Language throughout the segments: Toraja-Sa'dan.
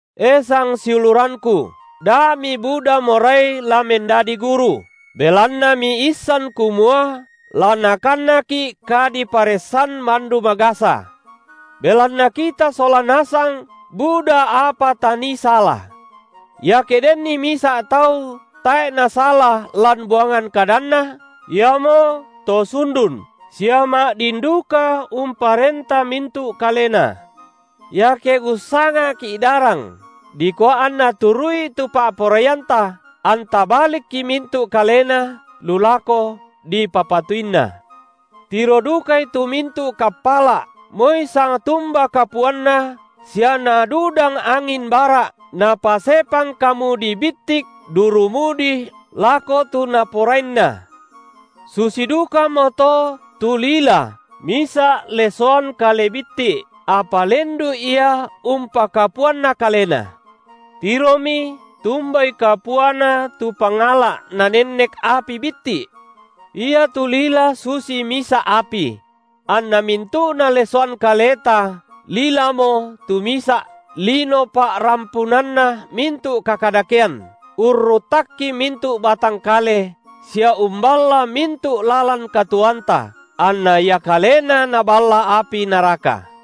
E sangsiulurangku, da mibuda morai la mendadi guru, belanna miissan kumua la nakannaki’ kadiparessan mandu magasa; belanna kita sola nasang buda apa tanii sala. Iake denni misa’ tau tae’ nasala lan buangan kadanna, iamoto sundun, sia ma’din duka umparenta mintu’ kalena. Iake ussanga’ki’ darang dikua anna turu’i tu pa’poraianta, anta balikki mintu’ kalena lu lako dipapatuanni. Tiro dukai tu mintu’ kappala’ moi sangtumba kapuanna, sia nadudang angin bara’, napasepang kamudi bittik duru mudi lako tu naporainna. Susi dukamoto tu lila misa’ lesoan kale bitti’, apa lendu’ ia umpakapuanna kalena. Tiromi tumbai kapuana tu pangala’ nanennek api bitti’. Iatu lila susi misa’ api; anna mintu’na lesoan kaleta lilamo tu misa’ lino pa’rampunanna mintu’ kakadakean, urruttakki mintu’ batang kale sia umballa mintu’ lalan katuoanta, anna ia kalena naballa api naraka.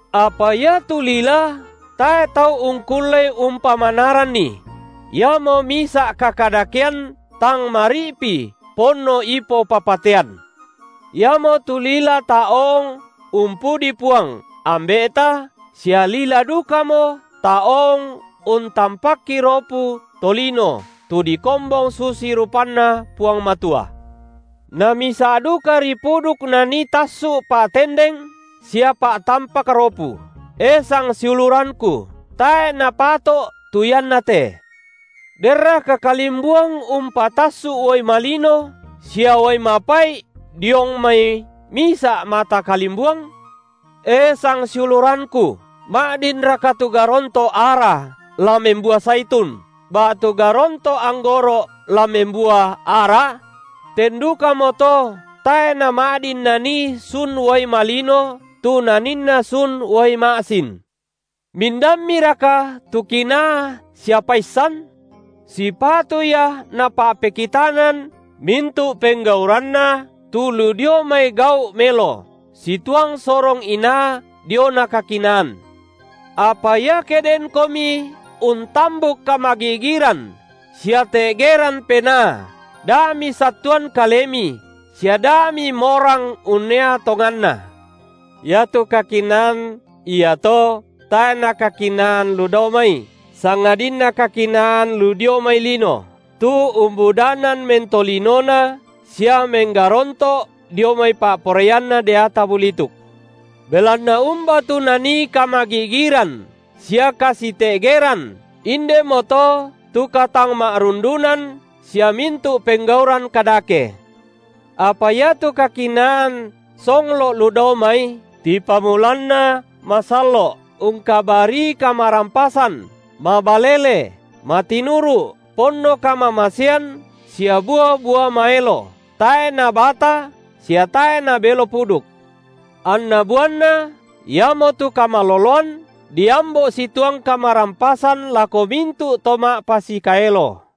apa iatu lila tae’ tau ungkullei umpamanaranni; iamo misa’ kakadakean tang mari’pi, ponno ipo papatean. Iamotu lila taoong umpudi Puang, Ambe’ta, sia lila dukamo taoong untampakki ropu tolino tu dikombong susi rupanNa Puang Matua. Na misa’ dukari puduk nanii tassu’ pa’tendeng sia pa’tampak ropu. E sangsiulurangku, tae’ napato’ tu iannate. Denraka kalimbuang umpatassu’ uai malino sia uai mapai’ diong mai misa’ mata kalimbuang? E sangsiulurangku ma’dinraka tu garonto’ ara la membua saitun, ba’tu garonto’ anggoro’ la membua ara? Ten dukamoto tae’ nama’din nanii sun uai malino tu naninna sun uai ma’sin. Mindammiraka tu kinaa sia paissan? Sipatu ia napa’pekitanan mintu’ penggauranna tu lu dio mai gau’ melo, situang sorong inaa diona kakinaan. Apa ia ke denkomi untambuk kamagi’giran sia te’geran penaa, da misattuan kalemi sia da mimorang unnea tonganna. Iatu kakinaan iato tae’ nakakinaan lu dao mai sangadinna kakinaan lu dio mai lino, tu umbudanan mentolinona, sia menggaronto’ dio mai pa’poraianna deata bulituk. Belanna umba tu nanii kamagi’giran sia kasite’geran, indemoto tu katangma’rundunan, sia mintu’ penggauran kadake. Apa iatu kakinaan songlo’ lu dao mai tipamulanna masallo’, ungkabarii kamarampasan, mabalele, matinuru’, ponno kamamasean sia bua-bua maelo, tae’ nabata, sia tae’ nabelo puduk. Anna buanna, iamotu kamaloloan, diambo’ situang kamarampasan lako mintu’ to ma’pasikaelo.